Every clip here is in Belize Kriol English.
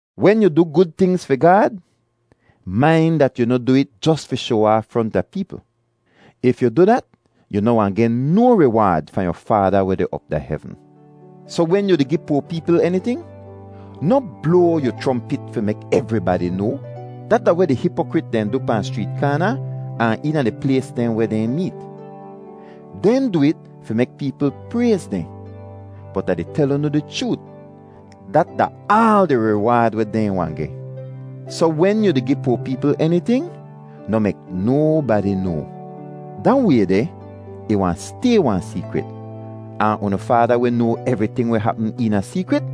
“Wen yu du gud tingz fi Gaad, main dat yu noh du it jos fi shoa aaf fronta peepl. If yu du dat, yu noh wahn geh no riwaad fahn yu Faada weh deh op da hevn. “Soh wen yu di gi poa peepl eniting, noh bloa yu chrompit fi mek evribadi noa. Dat da weh di hipokrit dehn du pahn schreet kaana ahn eena di plays dehn weh dehn meet. Dehn du it fi mek peepl prayz dehn, bot Ah di tel unu di chroot, dat da aal di riwaad weh dehn wahn geh. Soh wen yu di gi poa peepl eniting, noh mek nobadi noa. Da way deh ih wahn stay wahn seekrit, ahn unu Faada weh noa evriting weh hapm eena seekrit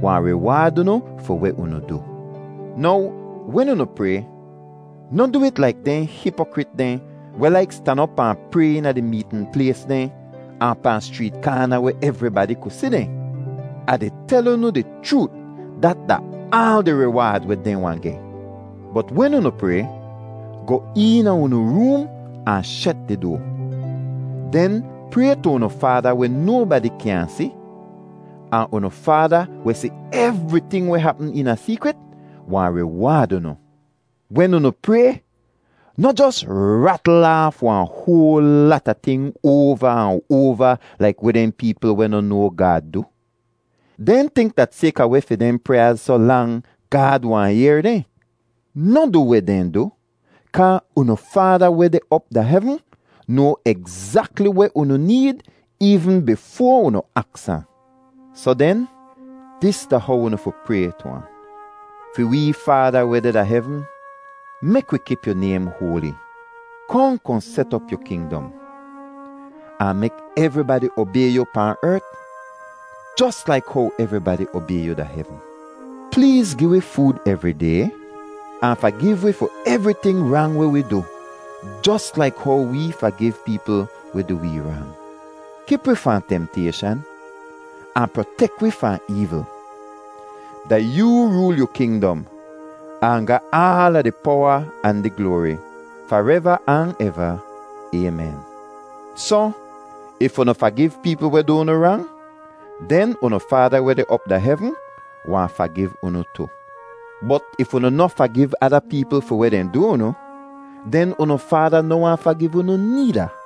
wahn riwaad unu fi weh unu du. “Now wen unu pray, noh du it laik dehn hipokrit dehn weh laik stan op ahn pray eena di meetn plays dehn ahn pahn schreet kaana weh evribadi ku si dehn. Ah di tel unu di chroot, dat da aal di riwaad weh dehn wahn geh. Bot wen unu pray, goh eena unu room ahn shet di doa. Den pray tu unu Faada weh nobadi kyaahn si, ahn unu Faada weh si evriting weh hapm eena seekrit wahn riwaad unu. “Wen unu pray, noh jos ratl aaf wahn hoal lata ting oava ahn oava laik weh dehn peepl weh noh noa Gaad du. Dehn tink dat sayka weh fi dehn pryaaz soh lang, Gaad wahn yehr dehn. Noh du weh dehn du, kaa unu Faada weh deh op da hevn noa egzakli weh unu need eevn bifoa unu aks ahn. “Soh den, dis da how unu fi pray tu ahn: ‘Fi wee Faada weh deh da hevn, mek wi kip yu naym hoali. Kohn kohn set op yu kingdom, ahn mek evribadi obay yu pahn ert jos laik how evribadi obay yu da hevn. Pleez gi wi food evri day. Ahn fagiv wi fi evriting rang weh wi du jos laik how wee fagiv peepl weh du wee rang. Kip wi fahn temtayshan, ahn protek wi fahn eevl.’ [Da yoo rool yu kingdom, ahn ga aala di powa ahn di gloari fareva ahn eva. Aymen.] “Soh, if unu fagiv peepl weh du unu rang, den unu Faada weh deh op da hevn wahn fagiv unu tu. Bot if unu noh fagiv ada peepl fi weh dehn du unu, den unu Faada noh wahn fagiv unu needa.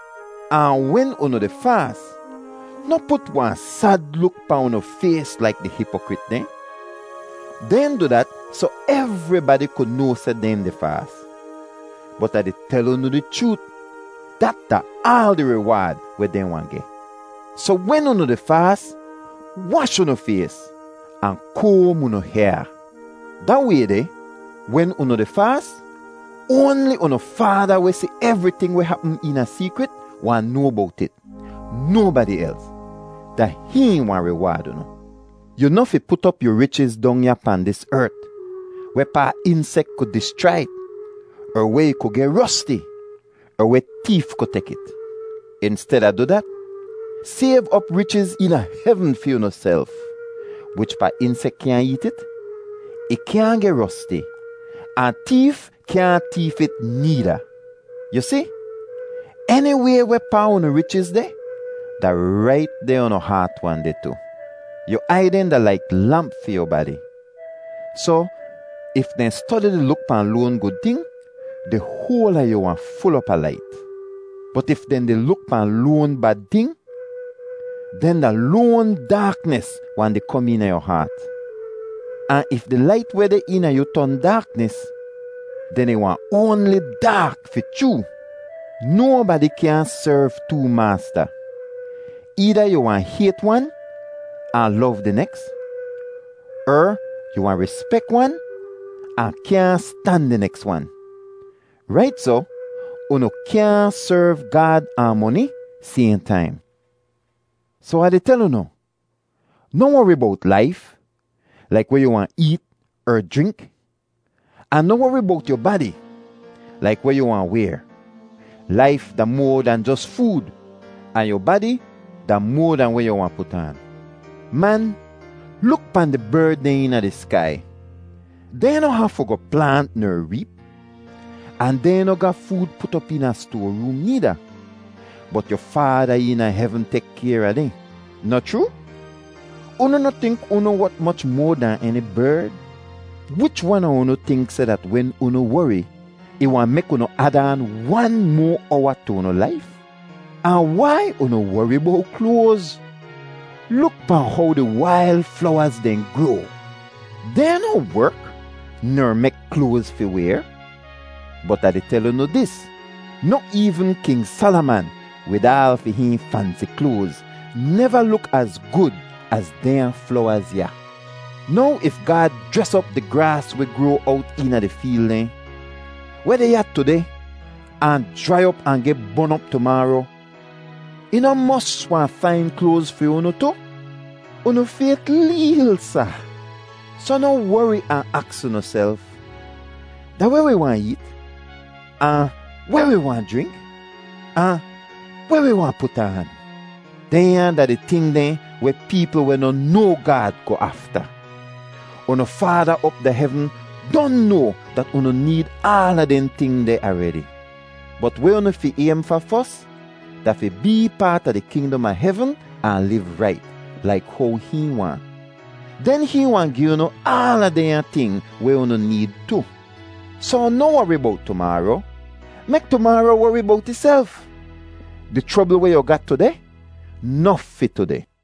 “Ahn wen unu di faas, noh put wahn sad luk pahn unu fays laik di hipokrit dehn. Dehn du dat soh evribadi ku noa seh dehn di faas. Bot Ah di tel unu di chroot, dat da aal di riwaad weh dehn wahn geh. Soh wen unu di faas, wash unu fays ahn koam unu hyaa. Da way deh wen unu di faas, oanli unu Faada weh si evriting weh hapm eena seekrit wahn noa bowt it; nobadi els. Da hihn wahn riwaad unu. “Yu noh fi put op yu richiz dong ya pahn dis ert, wehpaa insek ku dischrai it, er weh ih ku geh rosti, er weh teef ku tek it. Insteda du dat, sayv op richiz eena hevn fi unuself, wichpaa insek kyaahn eet it, ih kyaahn geh rosti, ahn teef kyaahn teef it needa. Yu si, eniway wehpaa unu richiz deh, da rait deh unu haat wahn deh tu. “Yu aiy dehn da laik lamp fi yu badi, soh if dehn stodi di luk pahn loan gud ting, di hoal a yu wahn ful op a lait. Bot if dehn di luk pahn loan bad ting, den da loan daaknis wahn di kom eena yu haat. Ahn if di lait weh deh eena yu ton daaknis, den ih wahn oanli daak fi chroo! “Nobadi kyaahn serv too maasta. Eeda yu wahn hayt wan ahn lov di neks, er yu wahn rispek wan ahn kyaahn stan di neks wan. Rait soh, unu kyaahn serv Gaad ahn moni sayhn taim. “Soh Ah di tel unu, noh wori bowt laif, laik weh yu wahn eet er jrink; ahn noh wori bowt yu badi, laik weh yu wahn wayr. Laif da moa dahn jos food, ahn yu badi da moa dahn weh yu wahn put aan. Man, luk pahn di berd dehn eena di skai; dehn noh hafu goh plaant ner reep. Ahn dehn noh ga food put op eena stoaroom needa, bot yu Faada eena hevn tek kayr a dehn, noh chroo? Unu noh tink unu wot moch moa dahn eni berd? Wich wan a unu tink seh dat wen unu wori ih wahn mek unu ad aan wan moa owa tu unu laif? “Ahn wai unu wori bowt kloaz? Luk pahn how di wail flowaz dehn groa. Dehn noh werk ner mek kloaz fi wayr, bot Ah di tel unu dis, noh eevn King Salaman, wid aal fi hihn fansi kloaz, neva luk az gud az dehnya flowaz ya. Now if Gaad jres op di graas weh groa owt eena di feel dehn, weh deh ya tudeh ahn jrai op ahn geh bon op tumaaro, ih noh mos wahn fain kloaz fi unu tu? Unu fayt leel, sa! “Soh noh wori ahn aks unuself, ‘Da weh wi wahn eet?’ ahn ‘Weh wi wahn jrink?’ ahn ‘Weh wi wahn put aan?’ Dehnya da di ting dehn weh peepl weh noh noa Gaad goh afta. Unu Faada op da hevn don noa dat unu need aala dehn ting deh aredi. Bot weh unu fi aym fa fos, da fi bee paat a di kingdom a hevn ahn liv rait, laik how hihn waahn. Den hihn wahn gi unu aala dehnya ting weh unu need tu. Soh noh wori bowt tumaaro; mek tumaaro wori bowt ihself. Di chrobl weh yu ga tudeh, nof fi tudeh.